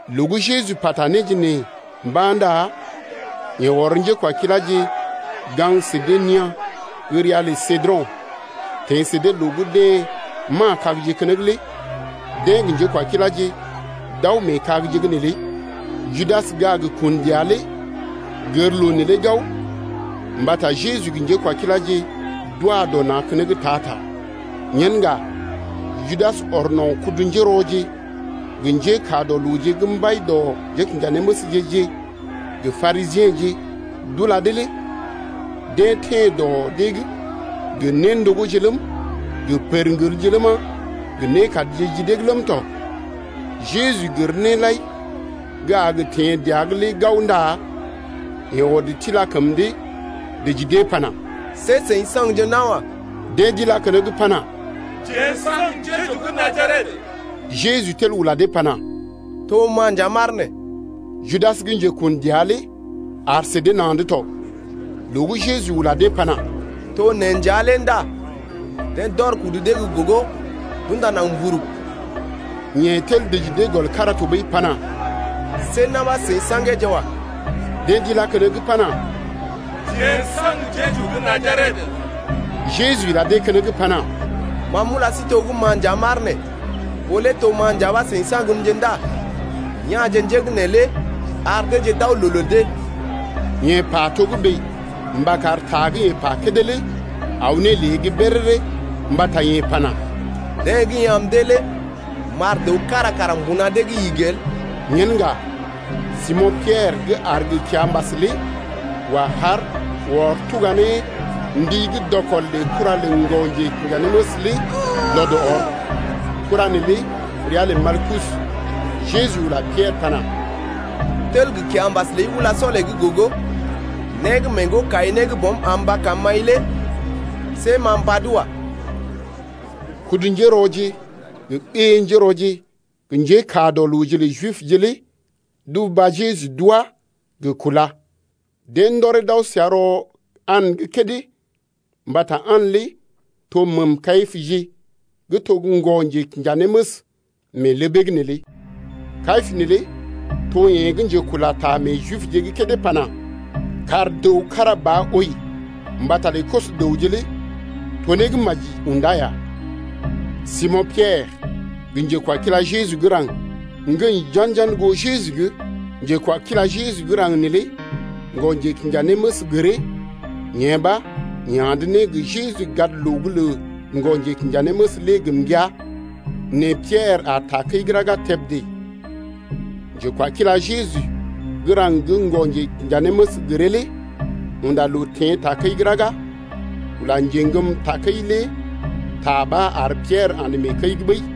Loo gə́ Jeju pata néje nee mba̰ ndá yeḛ ɔr njékwakiláje gaŋg sə dee nia̰ gə́ ria lə Sedro̰ teḛ sə dee loo gə́ deḛ ma̰a kagje keneŋ lé, deḛ gə njékwakiláje d’aw mee kagje’g neelé. Judas gə́ a gə kun dəa lé gər loo neelé gao mbata Jeju gə njékwakiláje d’wa dɔ na̰ keneŋ ta-ta. Yen ŋga Judas ɔr no̰ kudu-njérɔje gə njékaa dɔ looje gə́ mbai dɔ njékinjanéməsje-je gə Parisiḛje d’ula dee lé deḛ teḛ dɔ dee’g gə néndogóje ləm, gə pərŋgelje ləma, gə nékadje ji dee’g ləm tɔ. Jeju gər néje lai gə́ a gə teḛ dəa’g lé gao ndá yeḛ ɔd tila kəm dee dəji dee pana: See seḭ saŋgje nawa. Deḛ d’ilá keneŋ pana: Jeḛ n’saŋg Jeju gə́ Najaret. Jeju tel ula dee pana: To ma nja m’aar nee. Judas gə́ njekun dəa lé aar sə dee na̰’d tɔ. Loo gə́ Jeju ula dee pana: To neḛ nja lé ndá deḛ d’ɔr kudu dee gə́ gogo d’unda naŋg mburug. Yeḛ tel dəji dee gɔl kára tɔɓəi pana: See na̰ ɓa seḭ sa̰geeje wa. Deḛ d’ilá keneŋ pana: Jeḛ n’saŋg Jeju gə́ Najaret. Jeju ila dee keneŋ pana: Ma m’ula sí to gə́ ma nja m’aar nee. Ɓó lé to ma nja ɓa seḭ saŋgmje ndá ya̰je njé gə́ neelé ar deeje d’aw loo lə dee. Yeḛ pa togə́bè mba kar ta gə́ yeḛ pa kédé lé aw ne lée’g béréré mbata yeḛ pana: Deḛ gə́ i am dee lé m’ar dəw kára kara mbuna dee’g igi el. Yen ŋga Simo̰ Piɛrə gə́ aar gə kiambas lé wa haar ɔr tuga ne mbi gə́ dɔkɔl lə kura lə ŋgɔ-njekinjanéməs lé lɔd ɔr. Kura neelé ria lə Malkus. Jeju ula Piɛrə pana: Tel gə kiambas ləi ulá sɔlee’g gogo. Né gə́ mee ŋgo-kai-né gə́ Bɔm am mba karm m’ai lé see m’a mbad wa. Kudu-njérɔje gə ɓé-njérɔje gə njékaa dɔ looje lə Jibje lé d’uba Jeju d’wá gə kúla. Deḛ ndɔree d’aw səa rɔ An’g kédé, mbata An lé to məəm Kayipəje gə́ to ŋgɔ-njekinjanéməs mee ləbee’g neelé. Kayipə neelé to yeḛ gə́ njekula ta meḛ Jibje’g kédé pana: Kar dəw kára ba wəi mbata lə koso-dəwje lé to né gə́ maji yaa̰ ya. Simo̰ Piɛrə gə njekwakila Jeju gə́ raŋg ŋgəḭ jan-jan goo Jeju’g. Njekwakila Jeju gə́ raŋg neelé ŋgɔ-njekinjanéməs gəree, yee ɓa yeḛ andə ne gə Jeju gadloo’g lə ŋgɔ-njekinjanéməs lé gə mbəa. Nɛ Piɛrə aar takəi’g raga tebdé. Njekwakila Jeju gə́ raŋg gə́ ŋgɔ-njekinjanéməs gəree lé unda loo teḛ takəi’g raga ula njeŋgəm takəi lé ta ɓa ar Piɛrə andə mee kəi’g ɓəi.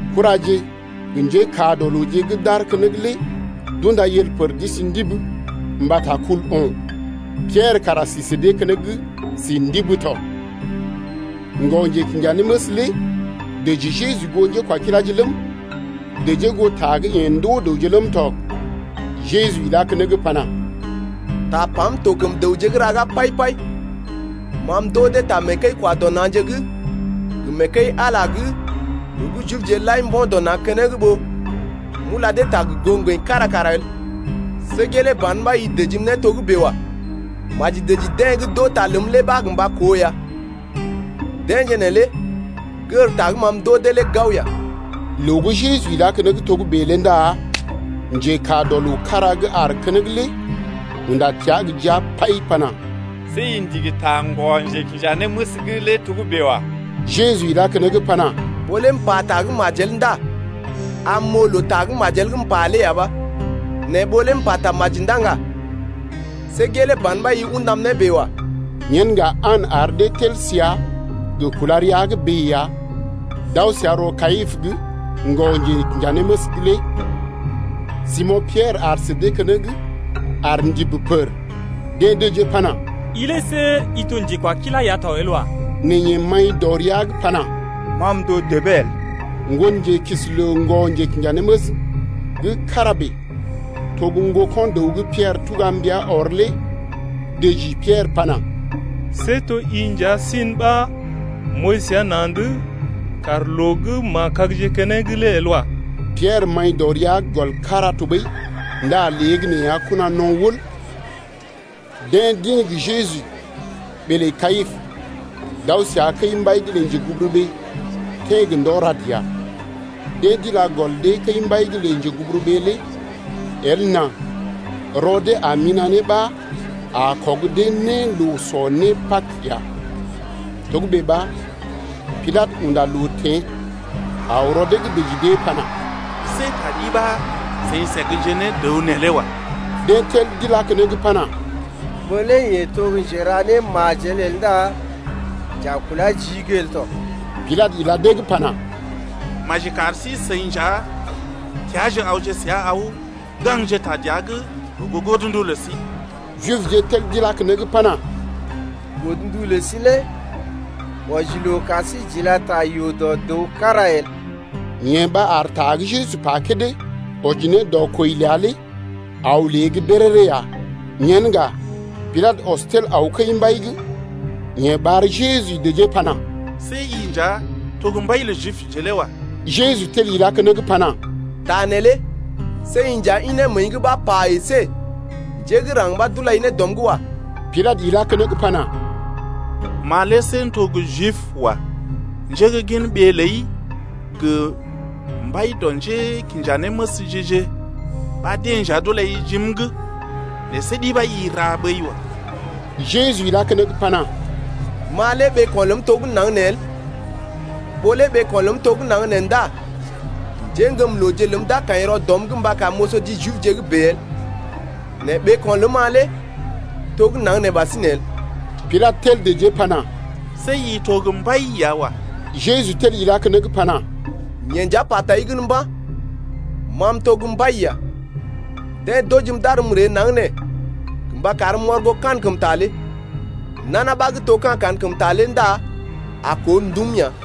Kuraje gə njékaa dɔ looje gə́ d’aar keneŋ lé d’unda yel pər d’isi ndibi mbata kul o̰. Piɛrə kara si sə dee keneŋ si ndibi tɔ. Ŋgɔ-njekinjanéməs lé dəji Jeju goo njékwakiláje ləm, dəjee goo ta gə́ yeḛ ndoo dəwje ləm tɔ. Jeju ilá keneŋ pana: Tapam to kəm dəwje’g raga pai-pai. Ma m’ndoo dee ta mee kəi-kwa-dɔ-na̰je’g gə mee kəi-Ala’g loo gə́ Jibje lai mbo̰ dɔ na̰ keneŋ ɓó m’ula dee ta gə goo ŋgəḭ kára kara el. See gelee ban ɓa i dəjim né togə́bè wa. Maji dəji deḛ gə́ d’oo ta ləm lé ɓa gə mba koo ya, deḛje neelé gər ta gə́ ma m’ndoo dee lé gao ya. Loo gə́ Jeju ilá keneŋ togə́bè lé ndá njekaa dɔ loo kára gə́ aar keneŋ lé unda təa gə jia pai pana: See i ndigi ta ŋgɔ-njekinjanéməs’g lé togə́bè wa. Jeju ilá keneŋ pana: Ɓó lé m’pata gə́ majel ndá am m’oo loo ta gə́ majel gə́ m’pa lé ya ɓa. Nɛ ɓó lé m’pata maji ndá ŋga, see gelee ban ɓa i undam ne bèe wa. Yen ŋga An ar dee tel səa gə kúla rəa’g bèe ya, d’aw səa rɔ Kayipə’g ŋgɔ-njekinjanéməs’g lé. Simo̰ Piɛrə aar sə dee keneŋ aar ndibi pər. Deḛ dəjee pana: I lé see i to njekwakilá ya to el wa. Nɛ yeḛ maḭ dɔ rəa’g pana: Ma m’to debee el. Ŋgonjelookisi lə ŋgɔ-njekinjanéməs gə́ kára bèe to gə́ ŋgoko̰ dəw gə́ Piɛrə tuga mbia ɔr lé dəji Piɛrə pana: See to i nja si’n ɓa m’ooi səa na̰’d loo gə́ ma̰a kagje keneŋ lé el wa. Piɛrə maḭ dɔ rəa’g gɔl kára tɔɓəi ndá léegəneeya kona no̰ wəl. Deḛ d’ḭ gə Jeju ɓee lə Kayipə d’aw səa kəi-mbai lə njeguburuɓee teḛ gə ndɔ rad ya. Deḛ d’ila gɔl dee kəi-mbai lə njeguburuɓee lé el nà rɔ dee a mina̰ ne ɓa a kɔg dee ne loo sɔ né Pag ya. Togə́bè ɓa Pilatə unda loo teḛ aw rɔ dee’g dəji dee pana: See ta ɗi ɓa seḭ səgje ne dəw neelé wa. Deḛ tel d’ilá keneŋ pana: Ɓó lé yeḛ to gə́ njera némajel el ndá j’a kulá jii’g el tɔ. Pilatə ila dee’g pana: Maji kari sí-seḭ nja teaaje awje səa aw gaŋgje ta dəa’g gə goo godndu lə sí. Jibje tel d’ilá keneŋ pana: Godndu lə sí lé wɔji loo kar sí j’ila ta yoo dɔ dəw kára el. Yee ɓa ar ta gə́ Jeju pa kédé wɔji ne dɔ kwəi ləa lé aw lée’g béréré ya. Yen ŋga Pilatə ɔs tel aw kəi-mbai’g. Yeḛ ɓar Jeju dəjee pana: See i nja to gə́ mbai lə Jibje lé wa. Jeju tel ilá keneŋ pana: Ta neelé see i nja ḭ ne məəi’g ɓa pa, əsé njé gə́ raŋg ɓa d’ulai ne dɔm’g wa. Pilatə ilá keneŋ pana: Ma lé see m’to gə́ Jib wa. Njé gə́ gin ɓee ləi gə mbai dɔ njékinjanéməsje-je ɓa deḛ nja d’ulai jim’g. Nɛ see ɗi ɓa i ra ɓəi wa. Jeju ilá keneŋ pana: Ma lé ɓeeko̰ ləm tɔ gə́ naŋg nee el. Ɓó lé ɓeeko̰ ləm tɔ gə́ naŋg nee ndá njéŋgəmlooje ləm d’a kaḭ rɔ dɔm’g mba karm m’oso ji Jibje’g bèe el, nɛ ɓeeko̰ ləm-ma lé to gə́ naŋg nee ɓasinè el. Pilatə tel dəjee pana: See i to gə́ mbai ya wa. Jeju tel ilá keneŋ pana: Yeḛ nja pa tai gən mba̰, ma m’to gə́ mbai ya. Deḛ d’ojim d’arm m’ree naŋg nee gə mba karm m’ɔr goo kankəmta lé. Nana ɓa gə́ to ka̰ kankəmta lé ndá a koo ndum ya.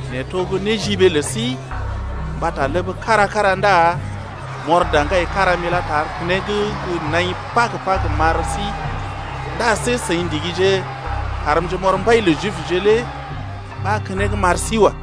Nɛ to gə́ néjiɓee lə sí mbata ləb kára-kára ndá m’ɔr daŋgai kára m’ilá tar keneŋ gə naḭ Pag-Pag m’ar sí, ndá see seḭ ndigije karmje m’ɔr mbai lə Jibje lé ɓa keneŋ m’ar sí wa.